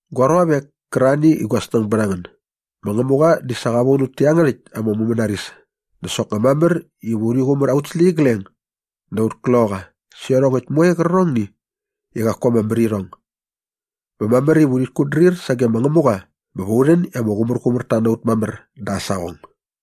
Gua ruavek kärarhani i gua snäng bät a ngän, ma Ngämuqa di sa qa von ut tä iangärhäkt ama mumänaris dä soknga mamär iva urhi qumär aut släqyigleng dä aut kloqaqa sä iarhongäkt moe qärqärhong i qaku ama mär irhong. Bä mamär iva urhit kutdrir sage ma Ngämuqa bä va u rhän i ama qumärqumärta na ut mamär da aa saqong.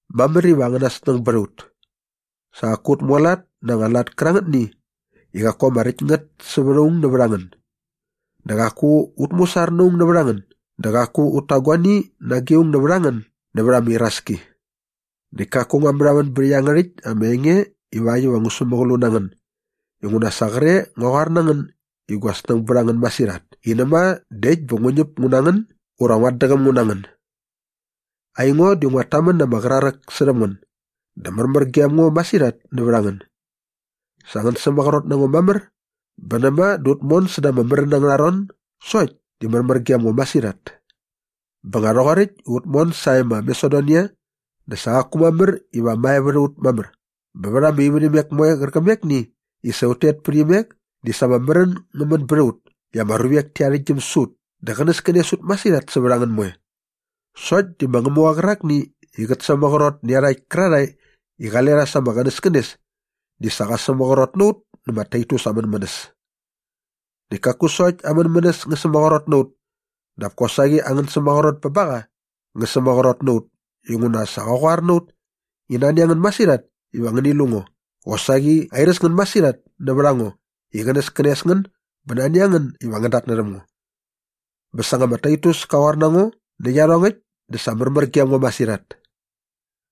Mamär iva angäna snäng bät a ut. Sa qaku ut mualat na anga lat kärangätni i qaku ama räkt ngät sävät aung nävät a ngän dä qaku ut musar na aung nävät a ngän dä qaku ut ta guani nage aung nävät a ngän nävät ama iraski. Näkt kaku ngua märhamän bät iangärhäkt ama enge ivakt iva ngu sämäqlu na ngän inguna sa qre ngua qoar na ngän i gua snäng bät a ngän masirhat i näma dä äkt bä ngu ñäp ngu na ngän ura nguat däqäm ngu na ngän. Aingo di nguat tamän na ama qraräk särhäm ngän dä märmär gem ngo masirhat nävät a ngän. Sa ngän sämaqrot na ngo mamär bä näma dä ut mon säda ama märän angärha ron sokt di märmär gem ngo masirhat. Bä nga rhoqoräkt i ut mon sae ma Masedonia dä sa qaku mamär iva mae vät a ut mamär bä vät ama ivärhimek moe qärqämekni i sa ut tet pät imek di sa ama märän ngä män bät a ut i ama ruvek ti arhäktgyäm sä ut dä qänäskänes ut masirhat sävät a ngän moe. Sokt di ma Ngämuqa qärakni i qät sämaqrot nä iarhakt kärarhae i qale rha sa ama qänäskänes di sa qa sämaqrot na ut nä ma Taitus aa mänmänäs. Näkt kaku sokt aa mänmänäs ngä sämaqrot na ut dap kosaqi angän sämaqrot bä ba qa ngä sämaqrot na ut inguna sa qa qoar na ut i nani a ngän masirhat iva ngäni lu ngo qosaqi airäs ngän masirhat nävät a ngo i qänäskänes ngän bä nani a ngän iva ngän datnärhäm ngo. Bä sa nga ma Taitus ka qoar na ngo nä iarhongäkt dä sa märmär gem ngo masirhat.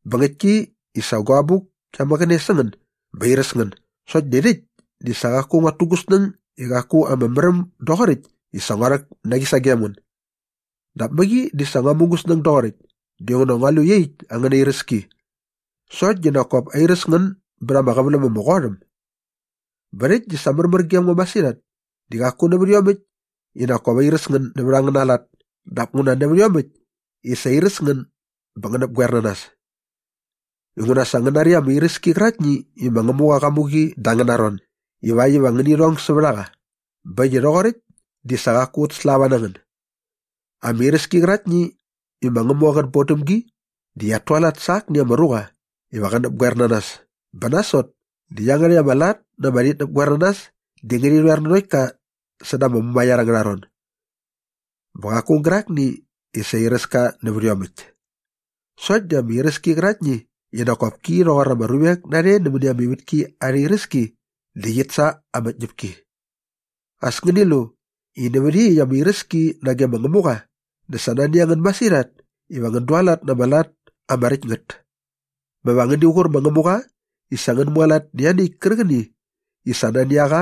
Bä ngäktki i sa gua abuk kia mäqäne sä ngän bä airäs ngän sokt di rhäkt di sa qaku nguat tu gu snäng i qaku ama märäm doqoräkt i sa ngua rhäk na qi sagem ngän. Dap mäqi di sa ngua mu gu snäng doqoräkt dinguna ngua lu i iaqyäkt angäna iräski. Sokt di nak kop airäs ngän bät ama qäväläm ama qot äm. Bä rhäkt di sa märmär gem ngo masirhat di qaku nävät iomäkt i nak kop airäs ngän nävät angäna lat dap nguna nävät iomäkt i sa airäs ngän bä ngän näpgoer na nas. Inguna sa ngän nari ama iräski qäraktni i ma Ngämuqa qa mu qi da angäna ron ivakt iva ngäni rhong sävät a qa bä äkt i rhoqoräkt di sa qaku ut slava na ngän. Ama iräski qäraktni i ma Ngämuqa qät bon däm gi di qiat tualat sa akni ama ruqa iva qä näpgoer na nas bä nasot dä iangärhäkt ama lat na ama rhitnäpgoernanas di ngärhi rhoer nanokt ka säda ama mumaiar angärha ron. Bä qaku aung gärakni i sa airäs ka nävät iomäkt. Sokt di ama iräski qäraktni i nak kop ki rhoqor ama ruvek narhe nämäni ama ivätki arha iräski di qit sa ama tñäpki. As ngäni lu i nävät iaqyäkt ama iräski nage ma Ngämuqa dä sa nani a ngän masirhat iva ngän dualat na ama lat ama räkt ngät. Bä va ngäni qur ma Ngämuqa i sa ngän mualat nä ianiäkt kärqäni i sa nani a qa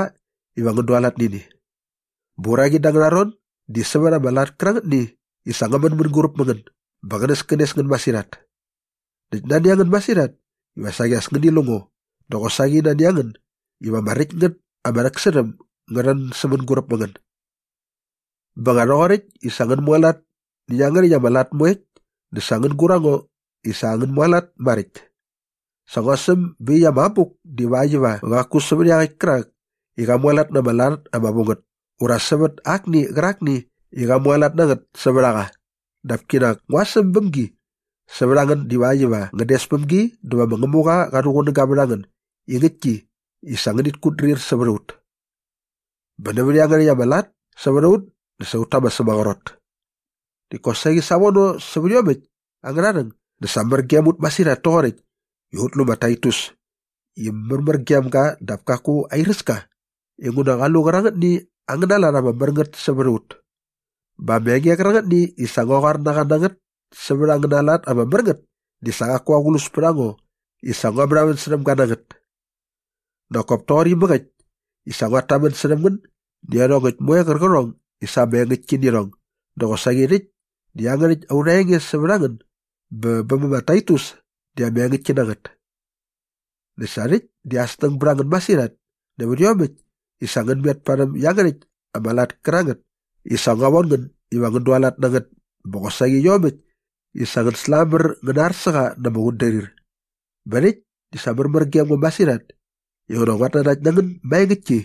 iva ngän dualat nä ini. Bä uraqi da angäna ron sävät ama lat kärangätni i sa ngä män mänguräp mä ngän bä qänäskänes ngän masirhat. Näkt nani a ngän masirhat iva saqi as ngäni lu ngo dä qosaqi nani a ngän iva ama räkt ngät ama rhäksärhäm ngä rhän sä mänguräp mä ngän. Bä nga rhoqoräkt i sa ngän mualat nä iangärhäkt ama lat moekt dä sa ngän gur a ngo i sa ngän mualat maräkt. Sa ngua säm bä iaqyäkt ama abuk divakt iva qaku sävät iaqäkt kärak i qa mualat na ama lat ama vu ngät ura sävät akni qärakni i qa mualat na ngät sävät a qa dap kinak ngua säm bäm gi sävät a ngän divakt iva ngän des päm gi dä va ma Ngämuqa qa rhuqunäga vät a ngän i ngäktki i sa ngänit kutdrir sävät a ut. Bä nävät iangärhäkt angäna lat sävät a ut dä sa ut ta ama sämaqrot. Näkt kosaqi savono sävät iomäkt angärha rhäng dä sa mär gem ut masirhat toqoräkt i ut lu ma Taitus i märmär gem ga dap kaku airäs ka inguna qa lu qärangätni angäna lat ama mär ngät sävät a ut. Bä ama enge qärangätni i sa ngua qoar na qa na ngät sävät angäna lat ama mär ngät di sa qaku aqlus pät a ngo i sa ngua märhamän särhäm ga na ngät. Nak kop toqor inamäk i sa ut tamän särhäm ngän nä iarhongäkt moe qärqärhong i sa ama engäktki nä irhong dä qosaqi rhäkt dä iangärhäkt aurha enge sävät a ngän bä bä ma Taitus di ama engäktki na ngät. Näkt sa rhäkt di aa snäng bät a ngän masirhat nävät iomäkt i sa ngän met parhäm iangärhäkt ama lat kärangät i sa ngua von ngän iva ngän dualat na ngät bä qosaqi iomäkt i sa ngän slamär ngäna ar sä qa na ama qutdrir. Bä rhäkt dä sa märmär gem ngo masirhat inguna nguat nanakt na ngän maengäktki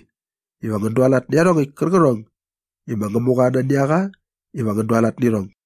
iva ngän dualat nä iarhongäkt kärqärhong i ma Ngämuqa nani a qa iva ngän dualat nä irhong.